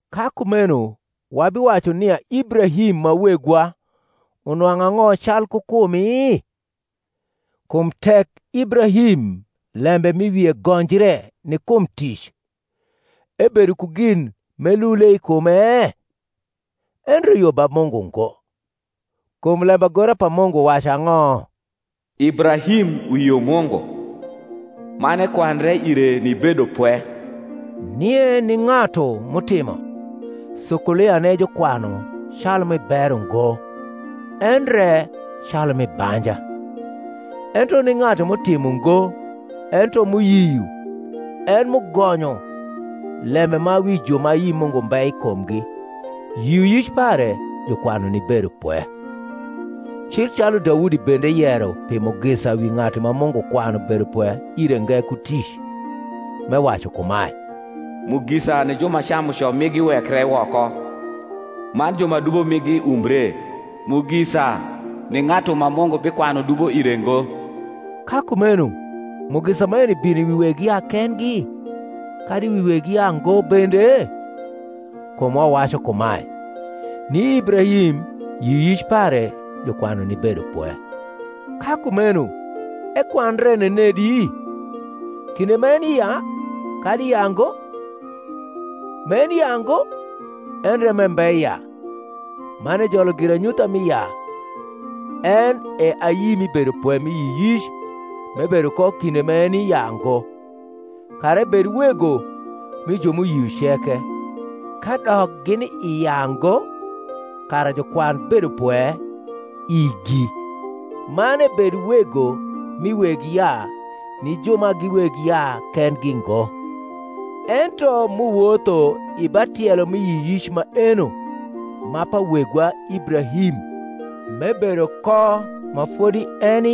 Ka kumeno wabiwacu nia Ibrahim, ma wegwa, unwang’u ang’o calku kumi? Kum tek Ibrahim lembe m’i wie gonjre ni kum tic, ebedo ku gin m’elule i kume? endre yo ba Mungu ngo. Kum lembagora pa Mungu wacu ang’o? Ibrahim uyio Mungu, man ekwandre ire ni bedopwe. Nie ni ng’atu m’utimo, sukuliane jukwanu calu mi bero ngo, endre calu mi banja. Ento ni ng’atu m’utimo ngo, ento m’uyio en m’ugonyo lembe ma wi ju ma ayi Mungu mbe i kumgi, yioyic pare jukwanu ni bedopwe. Cil calu Daudi bende yero pi mugisa wi ng’atu ma Mungu kwanu bedopwe ire nge ku tic, m’ewacu kumae, Mugisa ni ju ma camuco migi wekre woko, Man ju ma dubo migi umbre. Mugisa ni ng’atu ma Mungu bikwanu dubo ire ngo. Ka kumeno mugisa maeni bino wi weg yaa kendgi, kadi wi weg yaango bende? kum wawacu kumae, Ni Ibrahim yioyic pare jukwanu ni bedopwe. Ka kumeno ekwandre nenedi? kinde m’eni i yaa, kadi i yaango? M’eni i yaa ngo, endre m’embe i yaa: man ejolo giranyutha mi yaa, en e ayi mi bedopwe mi yioyic m’ebedo ko kinde m’eni i yaango: kara ebed wego mi ju m’uyio ceke, kadok gini i yaango, kara jukwan bedopwe igi; man ebed wego mi weg yaa ni ju ma gi weg yaa kendgi ngo, ento m’uwotho i ba tielo mi yioyic maeno ma pa wegwa Ibrahim m’ebedo ko ma fodi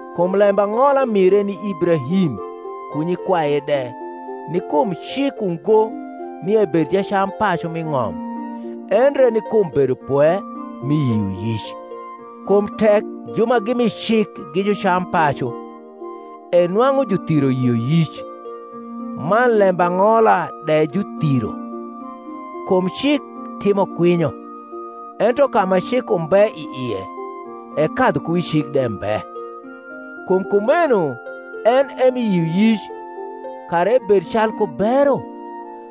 Kum lembang’ola mire ni Ibrahim ku nyikwaye de ni kum cik ungo nia ebed jacampacu m’i ng’om, endre ni kum bedopwe mi yioyic. Kum tek ju ma gi mi cik gi jucampacu, e nwang’u juthiro yioyic, man lembang’ola de juthiro: kum cik timo kwinyo; ento ka ma cik umbe i ie, e kadhukuwicik de mbe. Kum kumeno en e mi yioyic, kara ebed calku bero;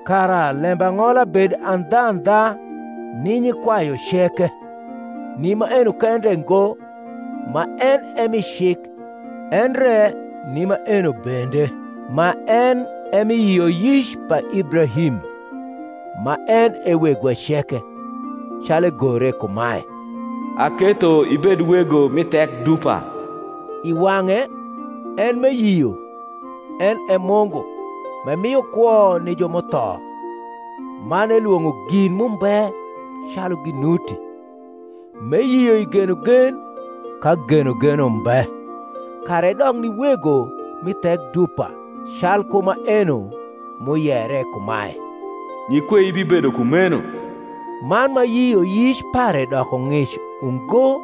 kara lembang’ola bed andhandha ni nyikwayu ceke; ni maeno kende ngo ma en e mi cik, endre ni maeno bende ma en e mi yioyic pa Ibrahim, ma en e wegwa ceke (calu egore kumae, Aketho ibed wego mi thek dupa) i wang’e en m’eyio, en e Mungu, m’emio kwo ni ju m’utho, man elwong’o gin m’umbe, calu ginuti. M’eyio i genogen ka genogen umbe, kara edok ni wego mi thek dupa, calku maeno m’uyere kumae, Nyikwei bibedo kumeno. Man ma yioyic pare doko ng’ic ungo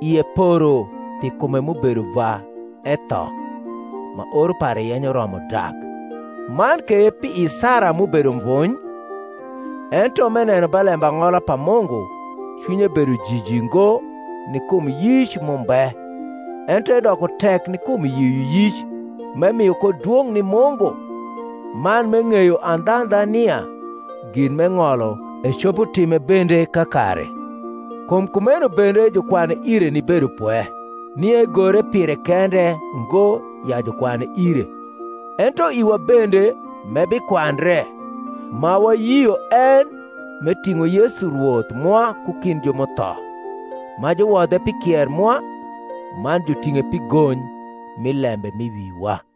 ie poro pi kume m’ubedo va etho (ma oro pare yenyo romo dak), man ke pi i Sara m’ubedo mvuuy: ento, m’eneno ba lembang’ola pa Mungu, cwinye bedo jiji ngo ni kum yic m’umbe, ento edoko tek ni kum yioyic, m’emio ko dwong’ ni Mungu, man m’eng’eyo andhandha nia gin m’eng’olo, ecopo time bende kakare. Kum kumeno bende jukwane ire ni bedopwe. Nie egore pire kende ngo, ya jukwane ire: ento iwa bende, m’ebikwandre, ma wayio en m’eting’o Yesu Rwoth mwa ku kind ju m’utho, ma juwodhe pi kier mwa, man juting’e pi gony mi lembe m’i wiwa.